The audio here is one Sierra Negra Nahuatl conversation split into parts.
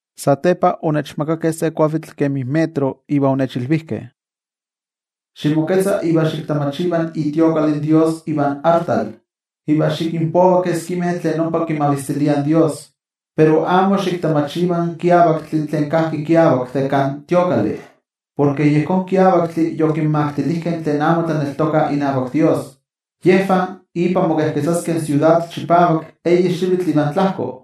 Satepa onechmakakeh se kuavitl kemi metro, iva onechilvijkeh: —Ximoketza iva xiktamachiva itemplo in Dios ivan artal, iva xikinpova keskimeh tlen ompa kimavistiliah in Dios. Pero amo xiktamachiva in kiavaktli tlen kajki kiavak de kan templo, porke yejón kiavaktli yokinmaktilijkeh tlen amo tlaneltokah inavak Dios. Yejvah ipan mokejketzaskeh in siudad chipavak eyi xivitl ivan tlajko.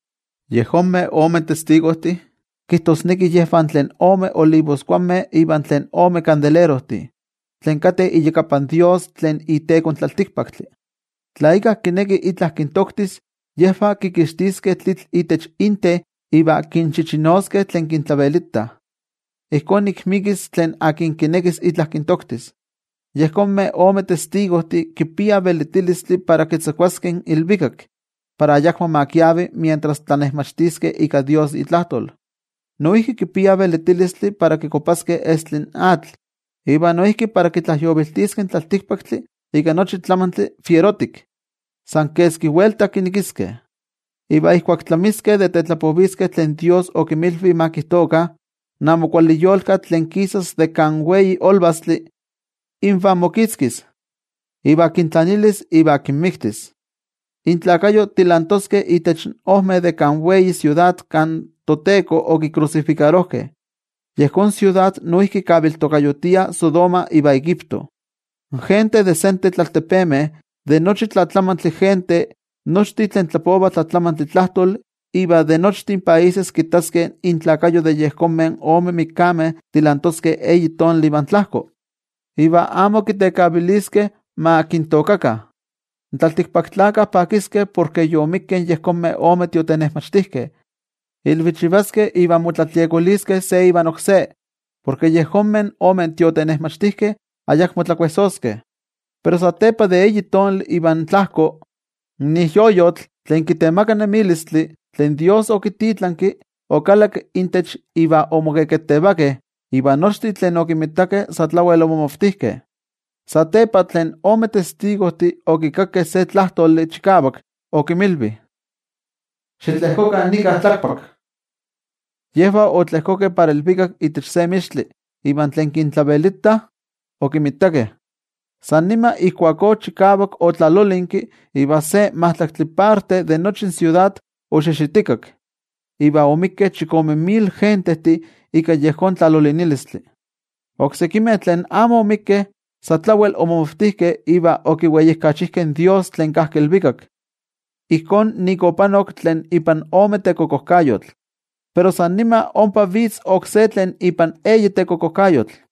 Yejonmeh ome testigojtih kijtosneki yejvah tlen ome olivoskuanmeh ivan tlen ome kandelerojtih, tlen kateh iyakapan Dios tlen iteko in tlaltikpaktli. Tla íkka kineki itla kintoktis, yejvah kixtiah tlitl itech inten iva kinchichinovah tlen kintlavelitah. Ijkó nik mikis tlen akin kinekis itla kintoktis. Yejonmeh ome testigojtih kipiah velitilistli para kitzakuaskeh in ilvikak, para ayakmo ma kiavi mientras tlanejmachtiskeh ika Dios itlajtol. Noijki kipiah velitilistli para kikuapaskeh estli in atl, iva noijki para kitlajyoviltiskeh in tlaltikpaktli ika nochi tlamantli fierotik, san keski welta kinekiskeh. Iva ijkuak tlamiskeh de tetlapoviskeh tlen Dios okinmilvi ma kijtokah, in amo kuali yolkatl tlen kisas de kan wei olvastli, invah mokitzkis, iva kintlanilis iva kinmiktis. Inkuerpo tilantoskeh itech ojmeh de kan wei siudad kan toTeko okikrusifikarojkeh. Yejón siudad noijki kaviltokayotiah Sodoma iva Egipto. In gentejtih de ik sentetl altepemeh, de nochi tlatlamantli gentejtih, nochtin tlen tlapovah tlatlamantli tlajtoli iva de nochtin países kittaskeh inkuerpo de yejonmeh ome mikameh tilantoskeh eyi tonali ivan tlajko, iva amo kitekaviliskeh ma kintookakah. In tlaltikpaktlakah pakiskeh porke yomikkeh yejonmeh omeh tiotenejmachtijkeh, ilvichivaskeh iva motlatliokoliskeh se ivan oksé, porke yejonmeh ome tiotenejmachtijkeh ayakmo tlakuejsoskeh. Pero satepa de eyi tonali ivan tlajko, in ijyoyotl tlen kitemaka nemilistli tlen Dios okititlanki, okalakki intech iva omoketevakeh. Iva nochtin tlen okinmitakeh sa tlawel omomavtijkeh. Satepa tlen ome testigojtih okikakkeh se tlajtoli chikavak, okinmilvi: —Xitlejkokah nika tlakpak. Yejvah otlejkokeh para ilvikak itech se mixtli iva tlen kintlavelitah okinmitakeh. San nima ijkuakó chikavak otlalolinki iva se majtlaktli parte de nochi in siudad oxixitikak, iva omikkeh chikome mil gentejtih ika yejón tlalolinilistli. Oksekimeh tlen amo omikkeh, sa tlawel omomavtijkeh iva okiweijkachijkeh in Dios tlen kajki ilvikak. Ijkó nik opanok tlen ipan ome tekokojkayotl, pero san nima ompa vitz oksé tlen ipan eyi tekokojkayotl.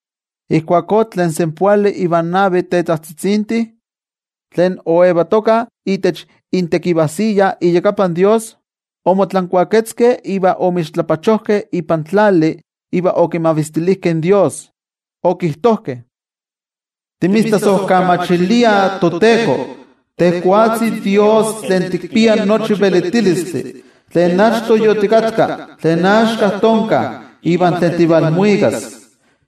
Ijkuakó tlen senpoali ivan navi tetajtzitzintih tlen oyetokah itech intekivajsiya iyakapan toYejwatzi, omotlankuaketzkeh iva omixtlapachojkeh ipan tlali iva okimavistilijkeh in toYejwatzi, okijtojkeh: Timitztlasojkamachiliah, toTeko, tejwatzi Dios tlen tikpia nochi velitilistli, tlen achto yotikatka, tlen axka tonka iva tlen tivalmuikas,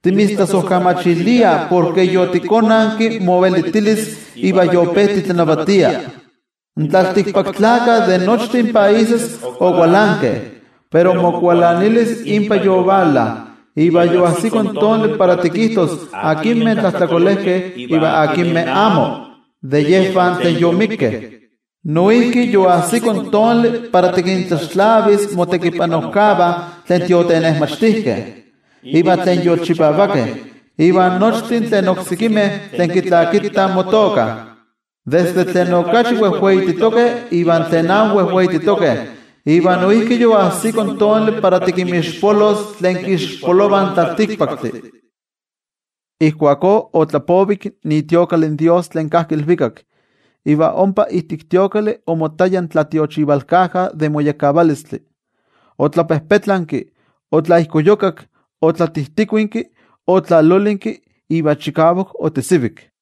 timitztlasojkamachiliah porke yotikonanki movelitilis iva yope titlanavatia. In tlaltikpaktlakah de nochtin países okualankeh, pero mokualanilis inpa yovala, iva yoajsiko in tonali para tikijtos akinmeh tlajtlakolejkeh iva akinmeh amo de yejvah tlen yomikkeh. Noijki yoajsiko in tonali para tikintlaxtlavis motekipanojkavah tlen tiotenejmachtijkeh, iva tlen yolchipavakeh, iva nochtin tlen oksekimeh tlen kitlakitah motoka, desde tlen okachi wejweititokeh iva tlen amo wejweititokeh. Iva noijki yoajsiko in tonali para tikinmixpolos tlen kixpolovah in tlaltikpaktli. Ijkuakó otlapovik itemplo in toYejwatzi tlen kajki ilvikak, iva ompa ijtik templo omottaya in tlatiochivalkaja de moyekkavalistli. Otlapejpetlanki, otlaijkoyukak, otlatijtikuinki, otlalolinki iva chikavak otesivik.